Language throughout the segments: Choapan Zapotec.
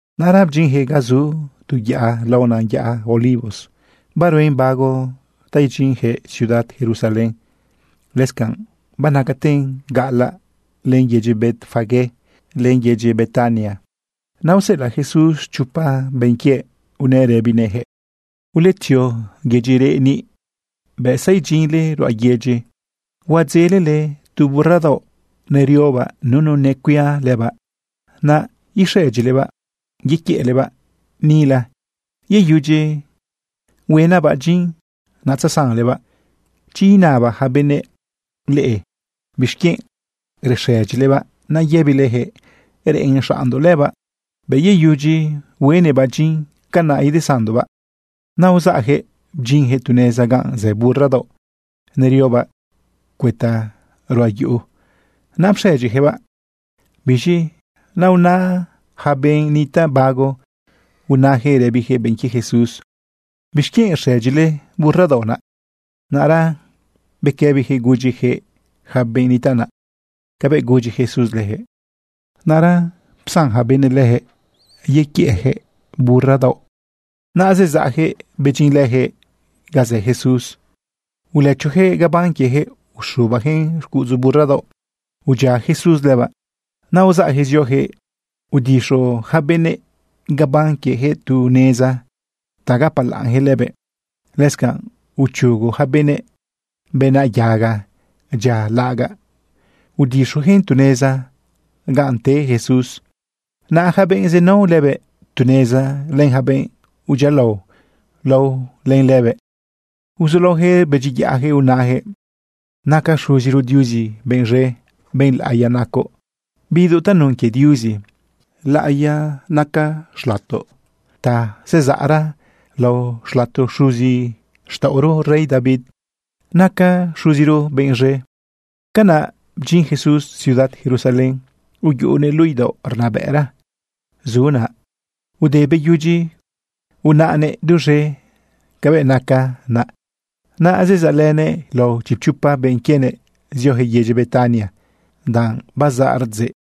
Naꞌra bdyinyaquëꞌ ga zu tu yaꞌa laonan yaꞌa Olivos. Baruen bago ta idyinyaquëꞌ ciudad Jerusalén. Lëscanꞌ banacaten gaꞌalaꞌ len yedyi Betfagé len yedyi Betania. Naꞌ useꞌelaꞌ Jesús chopa benꞌ quiëꞌ unëꞌ rëbinëꞌyaquëꞌ: ―Uletzio yedyi reꞌ niꞌ. Bëꞌ zaidyinle ruꞌa yedyi, huadzelele tu burra daoꞌ neriobaꞌ nunu necuia lëbaꞌ. Naꞌ ixëdyilebaꞌ yequiëꞌlebaꞌ nila. Yeyudyi uhuenaꞌbaꞌ dyin, natzesanlebaꞌ. Chi inaba yaca benëꞌ leꞌe bixquienꞌ rexëdyilebaꞌ, naꞌ yëbileyaquëꞌ: Reꞌen xaꞌnndoꞌ lëbaꞌ. Bëꞌ yeyudyi uhuenëꞌbaꞌ dyin, canaꞌ idesanndoꞌbaꞌ. Naꞌ uzaꞌyaquëꞌ bdyinyaquëꞌ tu neza ganꞌ zë burra daoꞌ neriobaꞌ cuëta ruꞌa yuꞌu. Naꞌ pxëdyiyaquëꞌbaꞌ. Biz̃i naꞌ unë yaca benꞌ nitaꞌ bago unayaquëꞌ rëbiyaquëꞌ benꞌ quie Jesús: ―¿Bixquienꞌ rxëdyile burra daoꞌ naꞌ? Naꞌra bequëbiyaquëꞌ gudyiyaquëꞌ yaca benꞌ nitaꞌ naꞌ cabëꞌ gudyi Jesús leyaquëꞌ. Naꞌra psan yaca benëꞌ leyaquëꞌ yequiëꞌyaquëꞌ burra daoꞌ. Naꞌ zezaꞌyaquëꞌ bedyinlëyaquëꞌ ga zë Jesús. Ulëchoyaquëꞌ gabán quieyaquëꞌ uxubayaquëꞌn xcuꞌudzu burra daoꞌ, udyia Jesús lëbaꞌ. Naꞌ uzaꞌyaquëꞌ zioyaquëꞌ udixu yaca benëꞌ gabán quieyaquëꞌ tu neza ta gapalaꞌnyaquëꞌ lëbëꞌ. Lëscanꞌ uchugo yaca benëꞌ bena yaga dyia laꞌagaꞌ udixuyaquëꞌn tu neza ganꞌ te Jesús. Naꞌ yaca benꞌ zenao lëbëꞌ tu neza len yaca benꞌ udyialao lao len lëbëꞌ, uzulaoyaquëꞌ rbedyiyaꞌyaquëꞌ unayaquëꞌ: ―¡Naca Xuziro Diuzi benꞌ z̃e! ¡Benꞌ laꞌiya nacoꞌ, bidoꞌ tanun quie Diuzi! ¡Laꞌiya naca xlatoꞌ ta zezaꞌra lao xlato xuzixtaꞌoro rey David! ¡Naca Xuziro benꞌ z̃e! Canaꞌ bdyin Jesús ciudad Jerusalén, uyuꞌunëꞌ luꞌu idaoꞌ rnabëꞌra zu naꞌ. Te beyudyi unaꞌnëꞌ duz̃e cabëꞌ naca naꞌ, naꞌ zezaꞌlënëꞌ lao chipchopa benꞌ quienëꞌ zioyaquëꞌ yedyi Betania danꞌ bazaꞌ rdzeꞌ.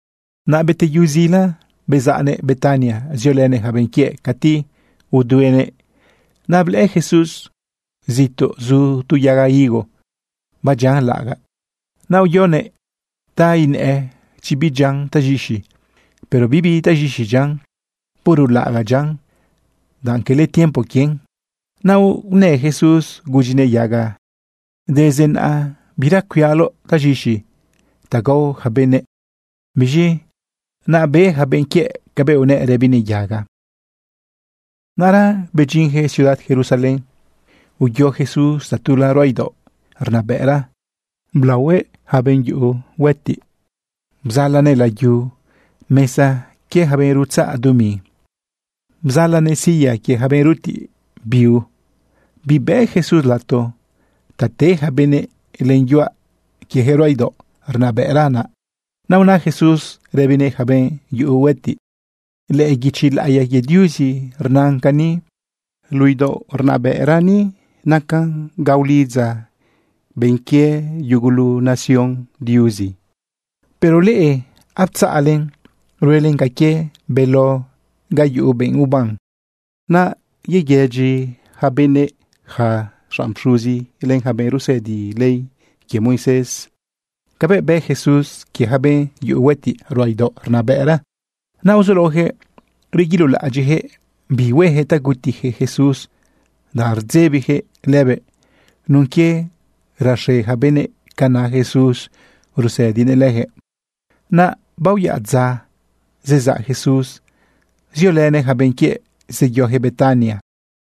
Naꞌ beteyu zila, bezaꞌnëꞌ Betania ziolënëꞌ yaca benꞌ quiëꞌ cati uduenëꞌ. Naꞌ blëꞌë Jesús zituꞌ zu tu yaga higo badyian laꞌagaꞌ. Naꞌ uyoguëꞌ ta inëꞌë chi bidyian taz̃ixi. Pero bibi taz̃ixi dyian, puro laꞌagaꞌ dyian danꞌ quele tiempo quien. Naꞌ unë Jesús gudyinëꞌ yaga: ―Desde naꞌa bira cuialoꞌ taz̃ixi ta gao yaca benëꞌ. Biz̃i naꞌ be yaca benꞌ quiëꞌ cabëꞌ unëꞌ rëbinëꞌ yaga. Naꞌra bedyinyaquëꞌ ciudad Jerusalén, uyo Jesús tatula ruꞌa idaoꞌ rnabëꞌra, blaohuëꞌ yaca benꞌ yuꞌu huëtiꞌ ganꞌ. Bzalanëꞌ layu mesa quie yaca benꞌ rutzaꞌ dumi. Bzalanëꞌ silla que yaca benꞌ rutiꞌ biu. Bibëꞌ Jesús lato ta te yaca benëꞌ len yuaꞌ quieyaquëꞌ ruꞌa idaoꞌ rnabëꞌra naꞌ. Naꞌ una Jesús rëbinëꞌ yaca benꞌ yuꞌu huëtiꞌ: ―Lëꞌë guichi laꞌiya quie Diuzi rnan cani: “Luꞌu idaoꞌ rnabëꞌra ni nacan ga ulidza benꞌ quie yugulu nación Diuzi.” Pero leꞌe aptzaꞌlen ruelen ca quie beló ga yuꞌu benꞌ uban. Naꞌ yeguedyi yaca benëꞌ yaca xanꞌ xuzi len yaca benꞌ rusëdi ley quie Moisés cabëꞌ bë Jesús quie yaca benꞌ yuꞌu huëtiꞌ ruꞌa idaoꞌ rnabëꞌra. Naꞌ uzulaoyaquëꞌ reguilolaꞌadyiꞌyaquëꞌ bi hueyaquëꞌ ta gutiyaquëꞌ Jesús, danꞌ rdzebiyaquëꞌ lëbëꞌ nun quie raxe yaca benëꞌ ca na Jesús rusëdinëꞌ leyaquëꞌ. Naꞌ baoyaꞌ dza, zezaꞌ Jesús ziolënëꞌ yaca benꞌ quiëꞌ zeyoyaquëꞌ Betania.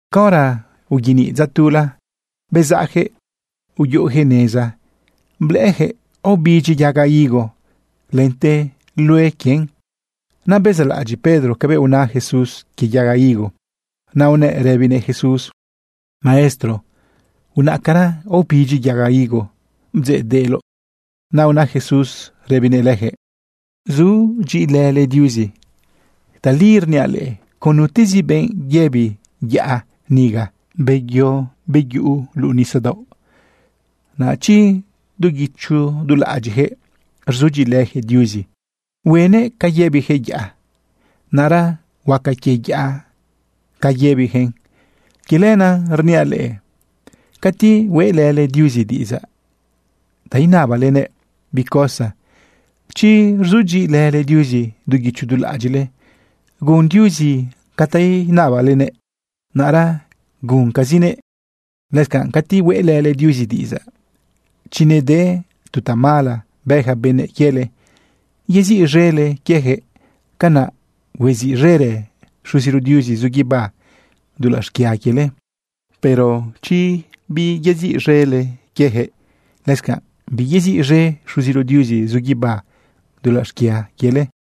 Caora uyeniꞌ dza tula, bezaꞌyaquëꞌ uyuꞌuyaquëꞌ neza blëꞌëyaquëꞌ aobidyi yaga higo lente lue quien. Naꞌ bezaꞌlaꞌadyiꞌ Pedro cabëꞌ una Jesús quie yaga higo, naꞌ unëꞌ rëbinëꞌ Jesús: ―Maestro, unaꞌcara, aobidyi yaga higo bdzeꞌdeꞌloꞌ. Naꞌ una Jesús rëbinëꞌ leyaquëꞌ: ―Sudyiꞌilële Diuzi. Tali rniaꞌ leꞌe, con nutezi benꞌ yëbi yaꞌa niga: “Beyo, yeyuꞌu luꞌu nisadaoꞌ”, naꞌ chi du guicho du laꞌadyiꞌyaquëꞌ rzudyiꞌilëyaquëꞌ Diuzi, huenëꞌ ca yëbiyaquëꞌ yaꞌa, naꞌra huaca quie yaꞌa ca yëbiyaquëꞌn. Quie lenaꞌ rniaꞌ leꞌe, cati hueꞌlële Diuzi diꞌidzaꞌ ta inabalenëꞌ bi cosa, chi rzudyiꞌilële Diuzi du guicho du laꞌadyiꞌle gun Diuzi ca ta inabalenëꞌ, naꞌra guncazinëꞌ. Lëscanꞌ cati hueꞌlële Diuzi diꞌidzaꞌ, chi nede tu tamala bë yaca benëꞌ quiele, yeziꞌz̃ele quieyaquëꞌ. Canaꞌ hueziꞌz̃erë Xuziro Diuzi zu guibá dulaꞌ xquia quiele. Pero chi biyeziꞌz̃ele quieyaquëꞌ, lëscanꞌ biyeziꞌz̃e Xuziro Diuzi zu guibá dulaꞌ xquia quiele.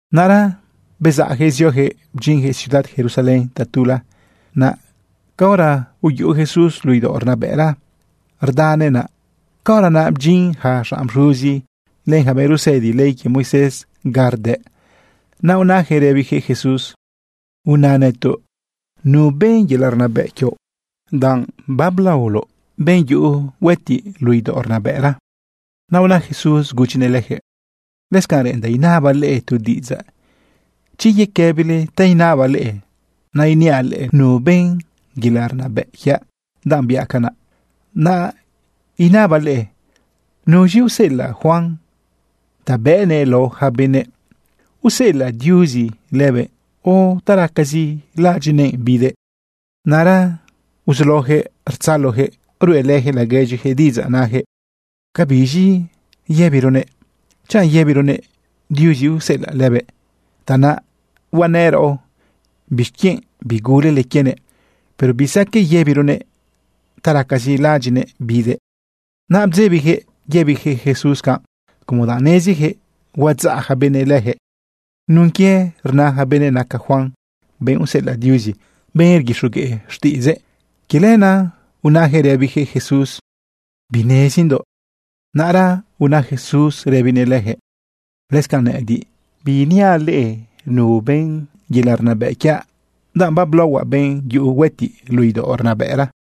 Naꞌra bezaꞌyaquëꞌ zioyaquëꞌ bedyinyaquëꞌ ciudad Jerusalén tatula. Naꞌ caora uyuꞌu Jesús luꞌu idaoꞌ rnabëꞌra rdanëꞌ naꞌ, caora naꞌ bdyin yaca xanꞌ pxuzi len yaca benꞌ rusëdi ley quie Moisés ga rdëꞌ. Naꞌ unayaquëꞌ rëbiyaquëꞌ Jesús: ―Una nëtoꞌ, ¿nu ben yelaꞌ rnabëꞌ quioꞌ, danꞌ bablaoloꞌ benꞌ yuꞌu huëtiꞌ luꞌu idaoꞌ rnabëꞌra? Naꞌ una Jesús gudyinëꞌ leyaquëꞌ: ―Lëscanꞌ reꞌendaꞌ inabaꞌ leꞌe tu diꞌidzaꞌ. Chi yequëbile ta inabaꞌ leꞌe, naꞌ iniaꞌ leꞌe nu ben yelaꞌ rnabëꞌ quiaꞌ danꞌ biaꞌ canaꞌ. Naꞌ inabaꞌ leꞌe: ¿Nuz̃i useꞌelaꞌ Juan ta bëꞌnëꞌ lao yaca benëꞌ? ¿Useꞌelaꞌ Diuzi lëbëꞌ o ta racazi laꞌadyiꞌnëꞌ bidëꞌ? Naꞌra uzulaoyaquëꞌ rtzaloyaquëꞌ ruꞌelëyaquëꞌ laguedyiyaquëꞌ diꞌidzaꞌ nayaquëꞌ: ―¿Cabiz̃i yëbironëꞌ? Chanꞌ yëbironëꞌ: “Diuzi useꞌelëꞌ lëbëꞌ”, tanaꞌ huanëꞌ raꞌo: “¿Bixquienꞌ bigulele quienëꞌ?” Pero bisaqueꞌ yëbironëꞌ: “Ta racazi laꞌadyiꞌnëꞌ bidëꞌ.” Naꞌ bdzebiyaquëꞌ yëbiyaquëꞌ Jesús canꞌ, como danꞌ neziyaquëꞌ huadzaꞌ yaca benëꞌ leyaquëꞌ nun quie rna yaca benëꞌ naca Juan benꞌ useꞌelaꞌ Diuzi, benꞌ rguixogueꞌ xtiꞌidzëꞌ. Quie lenaꞌ unayaquëꞌ rëbiyaquëꞌ Jesús: ―Binezindoꞌ. Naꞌra una Jesús rëbinëꞌ leyaquëꞌ: ―Lëscanꞌ nëꞌëdiꞌ, biiniaꞌ leꞌe nu ben yelaꞌ rnabëꞌ quiaꞌ, danꞌ bablaohuaꞌ benꞌ yuꞌu huëtiꞌ luꞌu idaoꞌ rnabëꞌra.